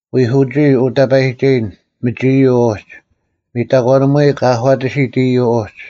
ᐎᒂᒋᐃ ᐅ ᑕᐸᔨᒋᒐᔨᓐ, ᒥᒋ ᐃᔪᐤ ᐅᒡ: ᒥᑕᒂᓂᒧᐎ ᑲ ᐊᒂᑎᓯᑦ ᐃᔪᐤ ᐅᒡ;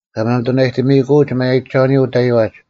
ᑲ ᒪᒥᑐᓇᔨᑎᒥᐃᑯᒡ ᒪᔭᔨᒐᐅᓂᔪᐤ ᐅᑕᐃᐛᒡ: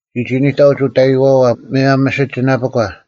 ᒋ ᒋᓂᑕᐅᒡ ᐅᑕᔨᔨᐛᐛ ᒧᔭᒻ ᒥᓯᒋᓇᐱᒂ;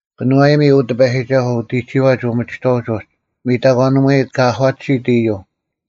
ᑭᓄᐛᔨᒥ, ᐅ ᑎᐸᔨᒋᒐᓱᐤ, ᐅᑎᒋᐛᒡ ᐅᒥᒋᑥᐅᒡ ᐅᒡ; ᒥᑕᒂᓂᒧᐎ ᑲ ᐊᒂᑎᓯᑦ ᐃᔪᐤ;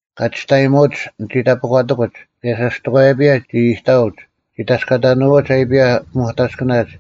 ᑲ ᒋᔅᑕᔨᒧᒡ ᓂᒋ ᑕᐱᒂᑎᑯᒡ, ᑭᔭ ᓴᔅᑎᒂᔭᐱᔭ ᒋ ᐃᑕᐊᐅᒡ; ᒋ ᑕᔅᑲᑕᓇᐅᒡ ᐊᐃᐱᔭ ᐱᒧᑕᔅᑭᓇᒡ;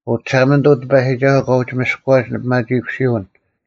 ᐅ ᒋᓴᒪᓂᑐᐤ ᑎᐸᔨᒋᒐᓱᐤ, ᑲ ᐅᒋ ᒥᔅᑯᐛᒡ ᓂᐱᒪᒋᐃᑯᓯᐅᓐ,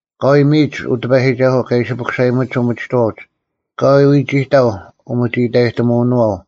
ᐊᑲᐎᔾ ᒥᔨᒡ, ᐅ ᑎᐸᔨᒋᒐᓱᐤ, ᑲ ᐃᓯ ᐱᑯᓴᔨᒧᒡ ᐅᒥᒋᑥᐅᒡ; ᐊᑲᐎᔾ ᐎᒋᑕᐤ ᐅᒥᒋᐃᑕᔨᑎᒧᐅᓄᐛᐤ;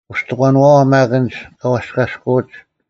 ᐅᔅᑕᒂᓄᐛᐛ ᒪᒃ ᐊᓐᒡ ᑲ ᐛᔅᑲᔅᑯᐅᒡ,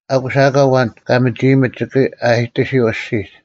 ᐊᑯᔅ ᐊᑲ ᐊᐛᓐ ᑲ ᒥᒋᐃᔨᒥᑦ ᒋᑭ ᐊᔨᑎᓯᐤ ᐊᔅᒋᒡ: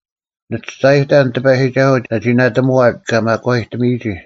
ᓂ ᒋᔅᒐᔨᑕᓐ ᑎᐸᔨᒋᒐᓱᐤ ᒐᒋ ᓇᑎᒧᐛᑦ ᑲ ᒪᒂᐃᑎᒥᔨᒋ,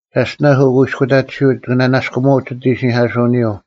ᒐᔅᑎᓇᔅ ᐅᑯᐃᔅᑯᑕᑎᓯᐅᒡ ᒋᑭ ᓂᓇᔅᑯᒧᐅᒡ ᒋᑦ ᐃᓯᓂᐧᑲᓱᐅᓂᔪᐤ: